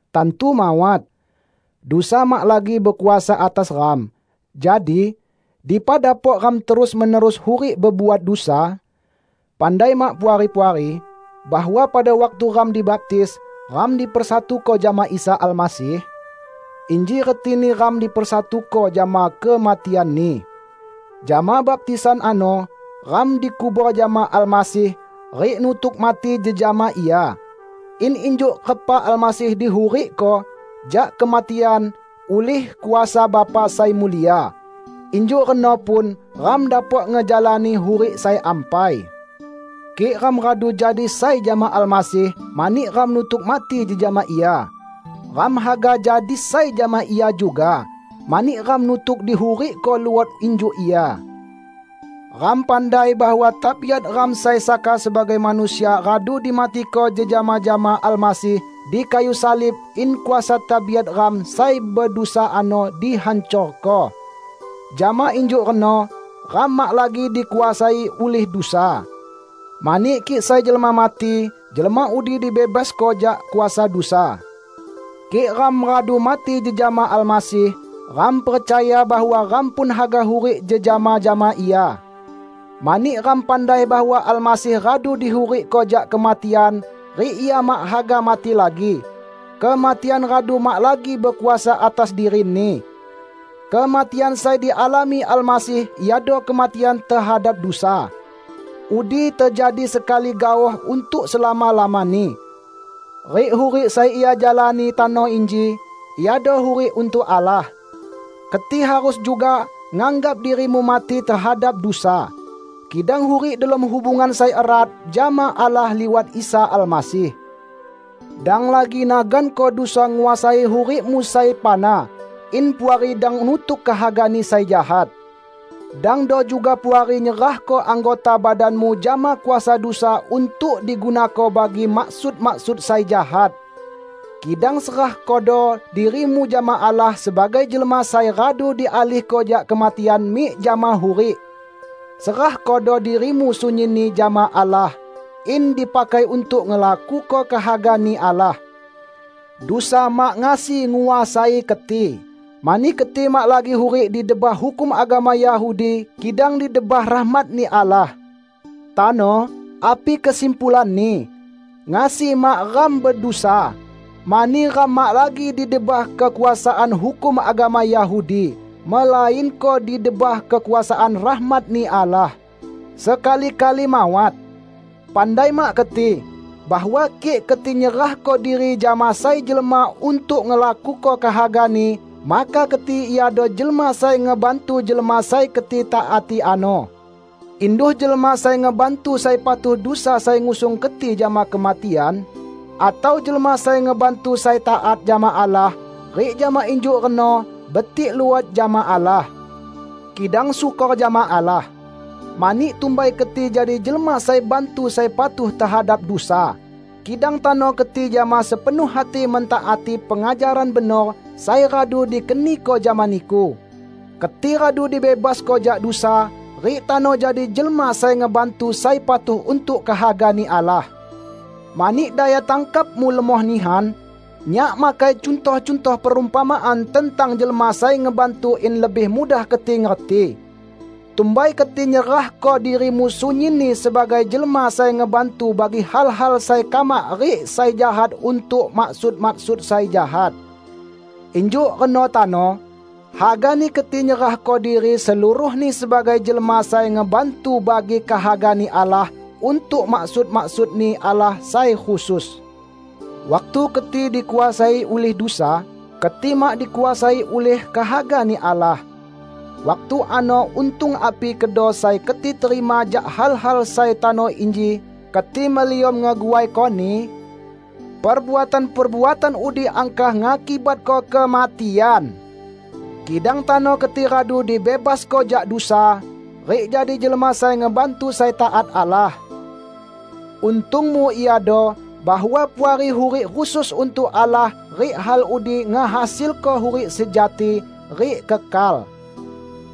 Tantu mawat! Dusa mak lagi bekuasa atas ram, jadi, dipa dapok ram terus-menerus hurik bebuat dusa? Pandai mak Puari-puari bahwa pada waktu ram dibaptis, ram dipersatuko jama Isa Almasih? Inji retini ram dipersatuko jama kematian-Ni. Jama baptisan ano, ram dikubor jama Almasih rik nutuk mati jejama Ia, in injuk repa Almasih dihurikko jak kematian ulih kuasa Bapa sai mulia, injuk reno pun ram dapok ngejalani hurik sai ampai. Kik ram radu jadi sai jama Almasih mani ram nutuk mati jejama Ia, ram haga jadi sai jama Ia juga mani ram nutuk dihurikko luot injuk Ia. Ram pandai bahwa tabiat ram sai saka sebagai manusia radu dimatiko jejama jama Almasih di kayu salib in kuasa tabiat ram sai bedusa ano dihancorko; jama injuk reno ram mak lagi dikuasai ulih dusa. Mani kik sai jelma mati, jelma udi dibebasko jak kuasa dusa. Kik ram radu mati jejama Almasih, ram percaya bahwa ram pun haga hurik jejama jama Ia. Mani ram pandai bahwa Almasih radu dihurikko jak kematian rik Ia mak haga mati lagi; kematian radu mak lagi bekuasa atas diri-Ni. Kematian sai dialami Almasih iado kematian tehadap dusa. Udi tejadi sekali gaoh untuk selama-lamani. Rik hurik sai Ia jalani tano inji iado hurik untuk Allah. Keti harus juga nganggap dirimu mati tehadap dusa, kidang hurik delom hubungan sai erat jama Allah liwat Isa Almasih. Dang lagi naganko dusa nguasai hurikmu sai fana in Puari dang nutuk kehagani sai jahat. Dangdo juga Puari nyerahko anggota badanmu jama kuasa dusa untuk digunako bagi maksud-maksud sai jahat. Kidang serahkodo dirimu jama Allah sebagai jelma sai radu dialihko jak kematian mik jama hurik. Serahkodo dirimu sunyinni jama Allah in dipakai untuk ngelakuko kehaga-Ni Allah. Dusa mak ngasi nguasai keti, mani keti mak lagi hurik di debah hukum agama Yahudi kidang di debah rahmat-Ni Allah. Tano, api kesimpulanni? Ngasi mak ram bedusa, mani ram mak lagi di debah kekuasaan hukum agama Yahudi, melainko di debah kekuasaan rahmat-Ni Allah? Sekali-kali mawat! Pandai mak keti bahwa kik keti nyerahko diri jama sai jelma untuk ngelakuko kehagani maka keti iado jelma sai ngebantu jelma sai keti taati ano -- induh jelma sai ngebantu sai patuh dusa sai ngusung keti jama kematian, atau jelma sai ngebantu sai taat jama Allah, rik jama injuk reno betik luot jama Allah. Kidang syukor jama Allah! Mani tumbai keti jadi jelma sai bantu sai patuh tehadap dusa, kidang tano keti jama sepenuh hati mentaati pengajaran benor sai radu dikeniko jama niku. Keti radu dibebasko jak dusa, rik tano jadi jelma sai ngebantu sai patuh untuk kehaga-Ni Allah. Mani daya tangkapmu lemoh nihan, nyak makai cuntoh-cuntoh perumpamaan tentang jelma sai ngebantu in lebih mudah keti ngerti. Tumbai keti nyerahko dirimu sunyinni sebagai jelma sai ngebantu bagi hal-hal sai kamak rik sai jahat untuk maksud-maksud sai jahat. Injuk reno tano, hagani keti nyerahko diri seluruhni sebagai jelma sai ngebantu bagi kehaga-Ni Allah untuk maksud-maksud-Ni Allah sai khusus. Waktu keti dikuasai ulih dusa, keti mak dikuasai ulih kehaga-Ni Allah. Waktu ano untung api kedo sai keti terima jak hal-hal sai tano inji keti meliom ngeguaikoni? Perbuatan-perbuatan udi angkah ngakibatko kematian! Kidang tano keti radu dibebasko jak dusa, rik jadi jelma sai ngebantu sai taat Allah. Untungmu iado bahwa Puari hurik khusus untuk Allah rik hal udi ngehasilko hurik sejati rik kekal.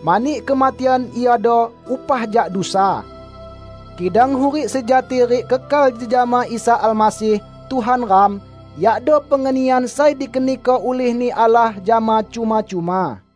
Mani kematian iado upah jak dusa; kidang hurik sejati rik kekal jejama Isa Almasih Tuhan ram yakdo pengenian sai dikeniko ulih-Ni Allah jama cuma-cuma.